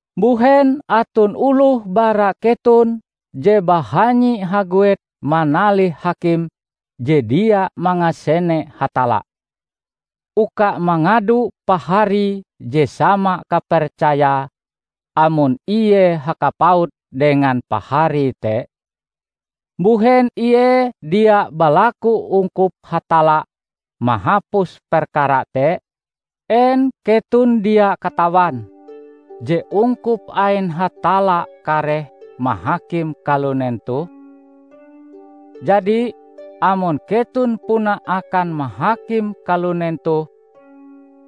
Mbuhen aton oloh bara keton je bahanyi haguet manalih hakim je dia mangasene Hatalla, uka mangadu paharie je sama kapercayae amon ie hakapaut dengan paharie te? Mbuhen ie dia balaku ungkup Hatalla mahapus perkara te? En keton dia katawan je ungkup ain Hatalla kareh mahakim kalunen toh? Jadi, amon keton puna akan mahakim kalunen toh,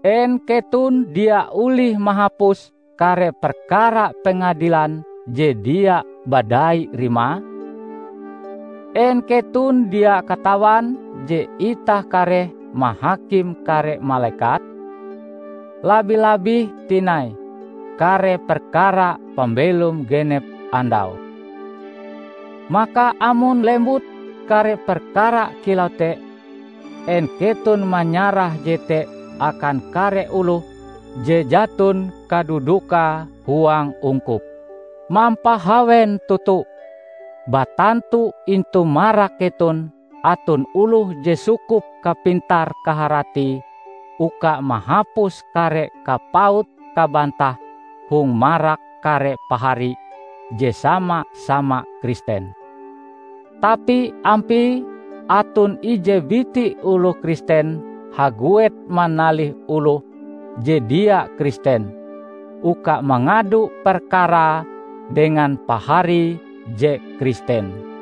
en keton dia olih mahapus kare perkara pengadilan je dia badai rimae? En keton dia katawan je itah kareh mahakim kare malekat? Labi-labih tinai kare perkara pambelom genep andau! Maka amon lembut kare perkara kilau te, en keton manyarah jete akan kare oloh je jaton kadudukae huang ungkup? Mampahawen toto! Batantu intu marak keton aton oloh je sukup kapintar kaharatie uka mahapus kare kapaut kabantah hong marak kare pahari je sama-sama Kristen! Tapi ampie aton ije biti oloh Kristen haguet manalih oloh je dia Kristen uka mangadu perkarae dengan paharie je Kristen!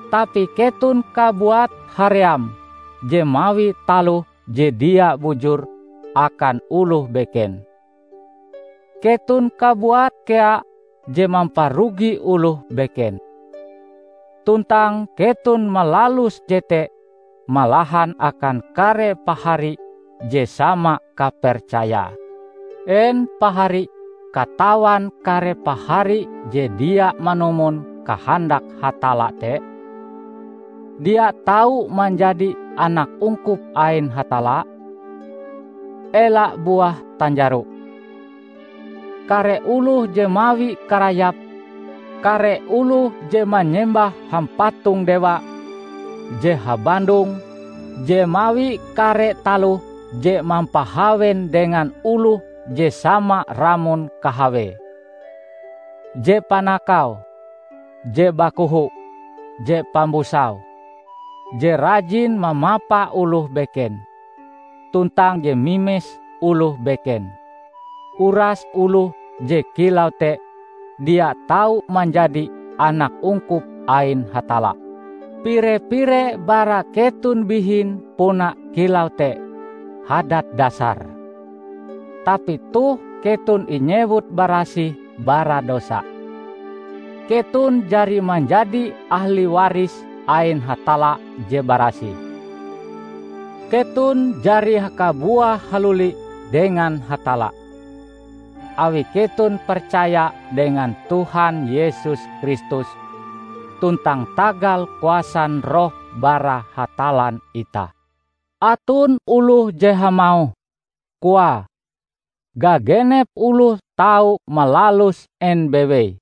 Tapi keton kabuat haream je mawi taloh je dia bujur akan oloh beken. Keton kabuat kea je mamparugi oloh beken. Tuntang keton malalus jete malahan akan kare pahari je sama kapercayae! En pahari katawan kare pahari je dia manumon kahandak Hatalla te, dia tau manjadi anak ungkup ain Hatalla? Ela buah tanjaro! Kare oloh je mawi karayap, kare oloh je manyembah hampatong dewa, je habandong, je mawi kare taloh je mampahawen dengan oloh je sama ramon kahawee, je panakau, je bakoho, je pambusau, je rajin mamapa oloh beken, tuntang je mimes oloh beken -- uras oloh je kilau te dia tau manjadi anak ungkup ain Hatalla. Pire-pire bara keton bihin puna kilau te hadat dasare. Tapi toh keton inyewut barasih bara dosa. Keton jari manjadi ahli waris ain Hatalla je barasih. Keton jari hakabuah haluli dengan Hatalla, awi keton percaya dengan Tuhan Yesus Kristus tuntang tagal kuasan Roh bara Hatallan itah. Aton oloh je hamauh, koae, gagenep oloh tau malalus en bewei,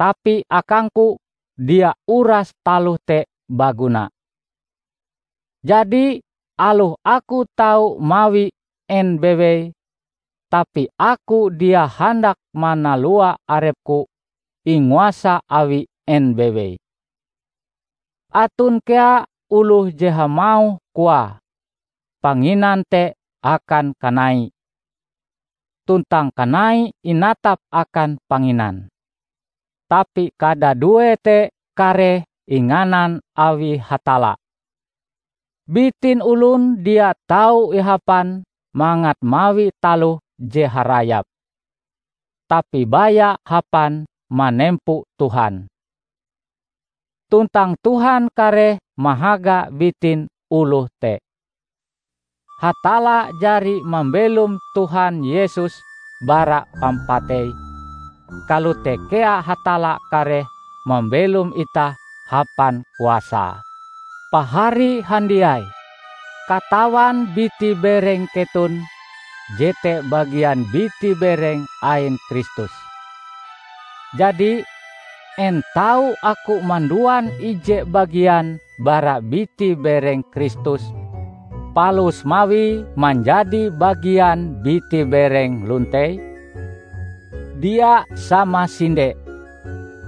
tapi akangku dia uras taloh te baguna. Jadi aloh aku tau mawi en bewei, tapi aku dia handak manalua arepku inguasa awi en bewei. Aton kea oloh je hamauh koae panginan te akan kanai, tuntang kanai inatap akan panginan. Tapi kadadue te kareh inganan awi Hatalla. Bitin olon dia tau ihapan mangat mawi taloh je harayap, tapi baya hapan manempo Tuhan. Tuntang Tuhan kareh mahaga bitin oloh te. Hatalla jari mambelom Tuhan Yesus bara pampatei, kalote kea Hatalla kareh mambelom itah hapan kuasae. Pahari handiai katawan biti-bereng keton jete bagian biti-bereng ain Kristus. Jadi, en tau aku manduan ije bagian bara biti-bereng Kristus palus mawie manjadi bagian biti-bereng lontei? Dia samasinde!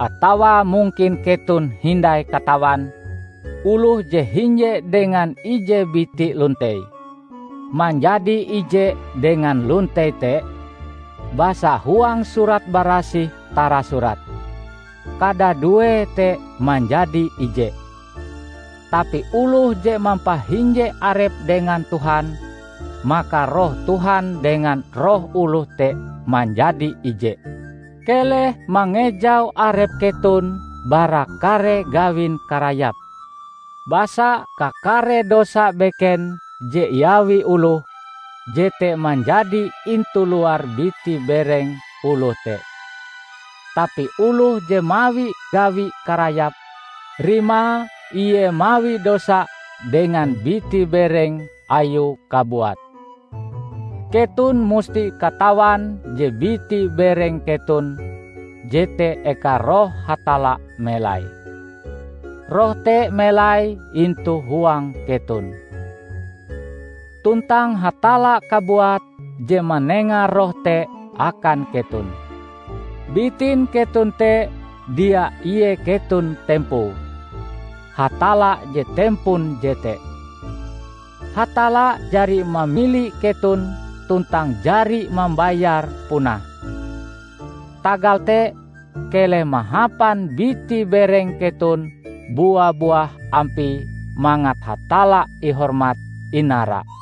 Atawa mungkin keton hindai katawan, oloh je hinje dengan ije biti lontei, manjadi ije dengan lontei te? Basa huang Surat Barasih tarasurat, "Kadaduee te manjadi ije." Tapi oloh je mampahinje arepe dengan Tuhan, maka Roh Tuhan dengan roh oloh te manjadi ije. Keleh mangejau arep keton bara kare gawin karayap. Basa kakare dosa beken je iawi oloh, jete manjadi intu luar biti-bereng oloh te. Tapi oloh je mawi gawi karayap, rimae ie mawi dosa dengan biti-bereng ayue kabuat. Keton musti katawan je biti-bereng keton jete eka Roh Hatalla melai. Roh te melai intu huang keton. Tuntang Hatalla kabuat je manenga Roh te akan keton. Bitin keton te dia ie keton tempoe. Hatalla je tempon jete. Hatalla jari mamili keton tuntang jari mambayare punah. Tagal te, keleh mahapan biti-bereng keton bua-buah ampie mangat Hatalla ihormat-inara.